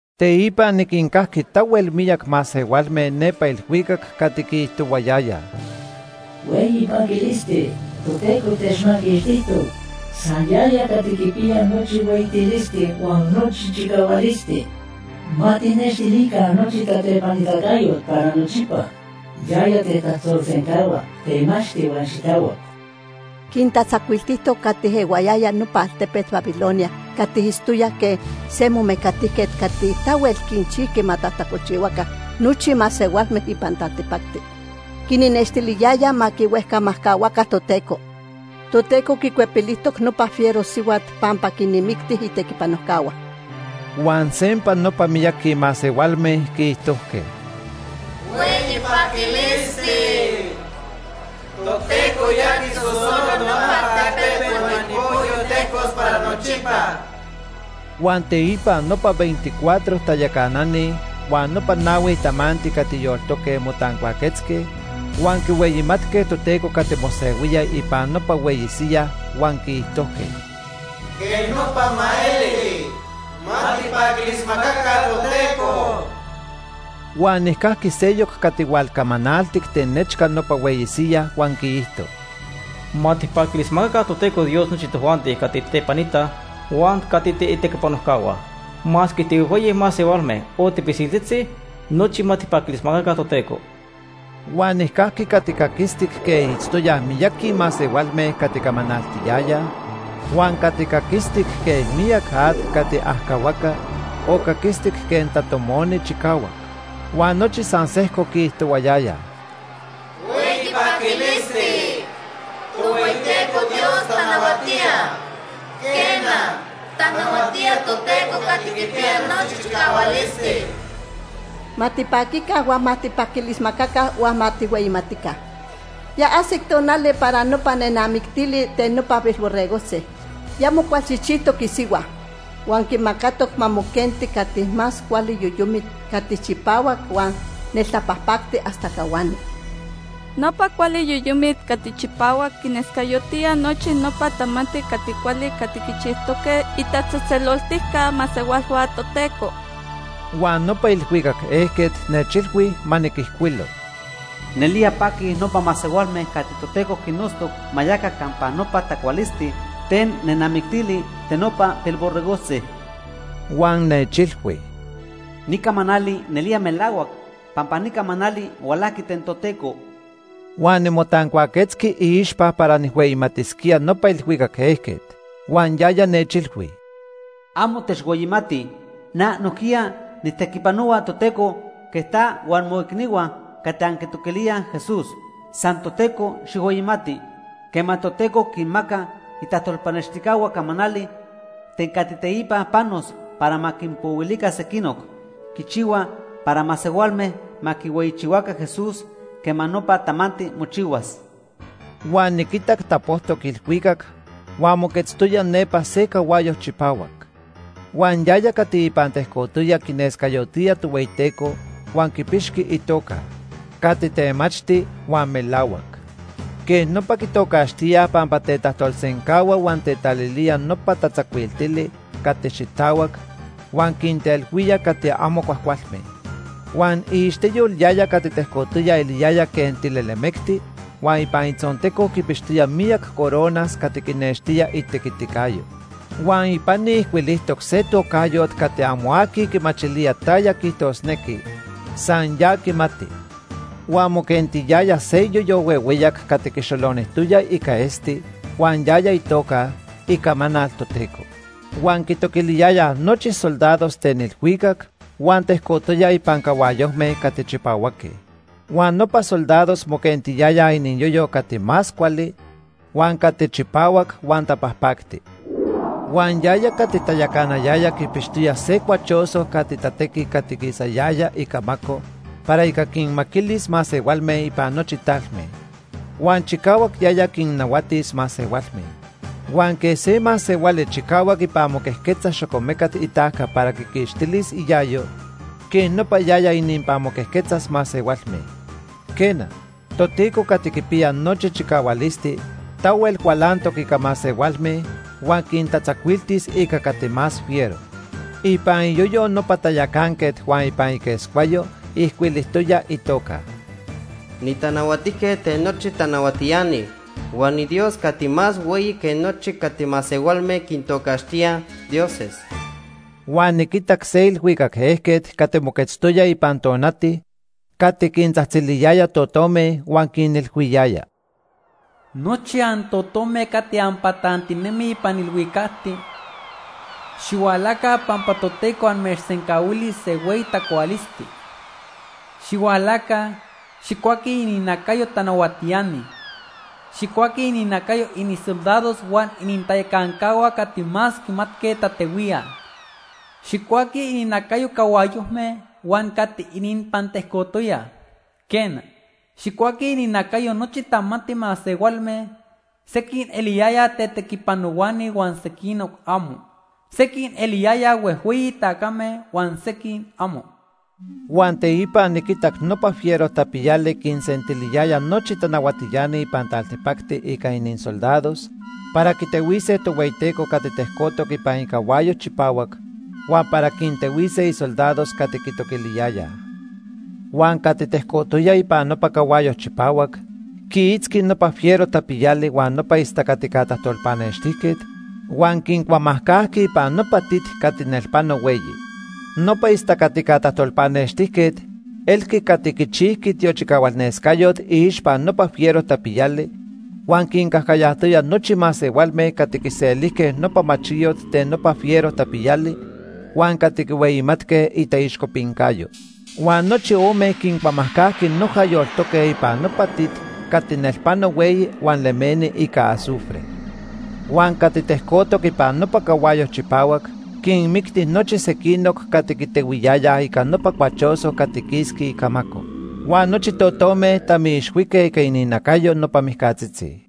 Teipa niquincajqui tahuel miyac masehualme nepa ilhuicac cati quiijtohuayayaj: “¡Hueyi paquilisti! Toteco techmaquixtijtoc. San yaya cati quipiya nochi hueyitilisti huan nochi chicahualisti. Ma tijnextilica nochi tatepanitacayot para nochipa. Yaya tetajtolsencahua temachti huan xitahuac. Quintatzacuiltijtoc cati ehuayayaj nopa altepet Babilonia cati itztoyaj quej se momecatijquet cati tahuel quinchijqui ma tajtacolchihuaca nochi masehualme ipan taltipacti. Quinnextiliyayaj ma quihuejcamajcahuaca Toteco. Toteco quicuepilijtoc nopa fiero sihuat pampa quinmicti itequipanojcahua.” Huan sempa nopa miyaqui masehualme quiijtojque: “¡Hueyi paquilisti! Toteco ya quisosolo nopa altepet huan ipocyo tejcos para nochipa.” Huan teipa nopa veinticuatro tayacanani huan nopa nahui tamanti cati yoltoque motancuaquetzque huan quihueyimatque Toteco cati mosehuía ipan nopa hueyi siyaj huan quiijtojque: “¡Quej nopa ma eli! ¡Ma tijpaquilismacaca Toteco!” Huan nijcajqui seyoc cati hualcamanaltic ten nechca nopa hueyi siyaj huan quiijto: “Ma tijpaquilismacaca Toteco Dios nochi tojuanti cati tijtepanitaj huan cati tiitequipanojcahua. Masque tihuejhueyi masehualme o tipisiltzitzi, nochi ma tijpaquilismacaca Toteco.” Huan nijcajqui cati caquistic quej itztoyaj miyaqui masehualme cati camanaltiyayaj, huan cati caquistic quej miyac at cati ajcahuaca, o caquistic quej tatomoni chicahuac. Huan nochi san sejco quiijtohuayayaj: “¡Hueyi paquilisti! Tohueyiteco Dios tanahuatía, Quena, tanahuatía Toteco Cati Quipiya Nochi Chicahualisti. Ma tipaquica huan ma tijpaquilismacaca huan ma tijhueyimatica. Ya ajsic tonali para nopa nenamictili ten nopa Pilborregojtzi. Ya mocualchijchijtoc isihua. Huan quimacatoc ma moquenti cati más cuali yoyomit cati chipahuac huan neltapajpactic hasta cahuani. Nopa cuali yoyomit cati chipahuac quinescayotía nochi nopa tamanti cati cuali cati quichijtoque itatzejtzeloltica masehualhua Toteco.” Huan nopa ilhuicac ejquet nechilhui ma niquijcuilo: “Nelía paquij nopa masehualme cati Toteco quinnotztoc ma yaca campa nopa tacualisti ten nenamictili ten nopa Pilborregojtzi.” Huan nechilhui: “Ni camanali nelía melahuac pampa ni camanali hualajqui ten Toteco.” Huan nimotancuaquetzqui iixpa para nijhueyimatisquía nopa ilhuicac ejquet. Huan yaya nechilhui: “Amo techhueyimati. Na nojquiya nijtequipanohua Toteco quej ta huan moicnihua cati anquitoquilíaj Jesús. San Toteco xijhueyimati. Quema Toteco quinmaca itajtolpanextijcahua camanali ten cati teipa panos para ma quinpohuilica sequinoc, quichihua para masehualme ma quihueyichihuaca Jesús quema nopa tamanti mochihuas.” Huan niquitac tapojtoc ilhuicac huan moquetztoya nepa se cahuayo chipahuac. Huan yaya cati ipan tejcotoya quinescayotía Tohueyiteco huan quipixqui itoca: Cati Temachti huan Melahuac. Quej nopa quitocaxtíaj pampa tetajtolsencahua huan tetalilía nopa tatzacuiltili cati xitahuac, huan quintehuía cati amo cuajcualme. Huan iixteyol yaya cati tecojtoya eliyaya quej tilelemecti huan ipan itzonteco quipixtoya miyac coronas cati quinextía itequiticayo. Huan ipani ijcuilijtoc se tocayot cati amo aqui quimachilía taya quiijtosnequi, san ya quimati. Huan moquentiyaya se iyoyo huehueyac cati quixolonijtoya ica esti huan yaya itoca: Icamanal Toteco. Huan quitoquiliyayaj nochi soldados ten ilhuicac huan tejcotoyaj ipan cahuayojme cati chipahuaque. Huan nopa soldados moquentiyayaj iniyoyo cati más cuali, huan cati chipahuac huan tapajpacti. Huan yaya cati tayacanayaya quipixtoya se cuachoso cati tatequi cati quisayaya icamaco para ica quinmaquilis masehualme ipan nochi talme. Huan chicahuac yaya quinnahuatis masehualme. Huan quej se masehuali chicahuac ipan moquejquetza xocomecat itajca para quiquixtilis iayo, quej nopa yaya ininpan moquejquetzas masehualme. Quena, Toteco Cati Quipiya Nochi Chicahualisti tahuel cualantoc ica masehualme huan quintatzacuiltis ica cati más fiero. Ipan iyoyo nopa tayacanquet huan ipan iquescuayo ijcuilijtoya itoca: “Nitanahuatijquet ten nochi tanahuatiani huan niDios cati más hueyi que nochi cati masehualme quintocaxtíaj ‘dioses’.” Huan niquitac se ilhuicac ejquet cati moquetztoya ipan tonati cati quintzajtziliyaya totome huan quinilhuiyaya: “Nochi antotome cati anpatantinemij ipan ilhuicacti, xihualaca pampa Toteco amechsencahuilis se hueyi tacualisti. Xihualaca, xijcuaquij ininacayo tanahuatiani. Xijcuaquij ininacayo inisoldados huan inintayacancahua cati más quimatque tatehuíaj. Xijcuaquij ininacayo cahuayojme huan cati ininpan tejcotoyaj. Quena, xijcuaquij ininacayo nochi tamanti masehualme; sequij eliyayaj tetequipanohuani huan sequinoc amo. Sequij eliyayaj huejhueyi tacame huan sequij amo.” Huan teipa niquitac nopa fiero tapiyali quinsentiliyaya nochi tanahuatiani ipan taltipacti ica inisoldados para quitehuise Tohueyiteco cati tejcotoc ipan icahuayo chipahuac huan para quintehuise isoldados cati quitoquiliyayaj. Huan cati tejcotoya ipan nopa cahuayo chipahuac quiitzqui nopa fiero tapiyali huan nopa istacatica tajtolpanextijquet, huan quincuamajcajqui ipan nopa tit cati nelpano hueyi. Nopa istacatica tajtolpanextijquet elqui cati quichijqui tiochicahualnescayot iixpa nopa fiero tapiyali huan quincajcayajtoya nochi masehualme cati quiselijque nopa machiyot ten nopa fiero tapiyali huan cati quihueyimatque itaixcopincayo. Huan nochi ome quincuamajcajqui noja yoltoque ipan nopa tit cati nelpano hueyi huan lemeni ica azufre. Huan cati tejcotoc ipan nopa cahuayo chipahuac quinmicti nochi sequinoc cati quitehuiyayaj ica nopa cuachoso cati quisqui icamaco. Huan nochi totome tamiixhuique ica ininacayo nopa mijcatzitzi.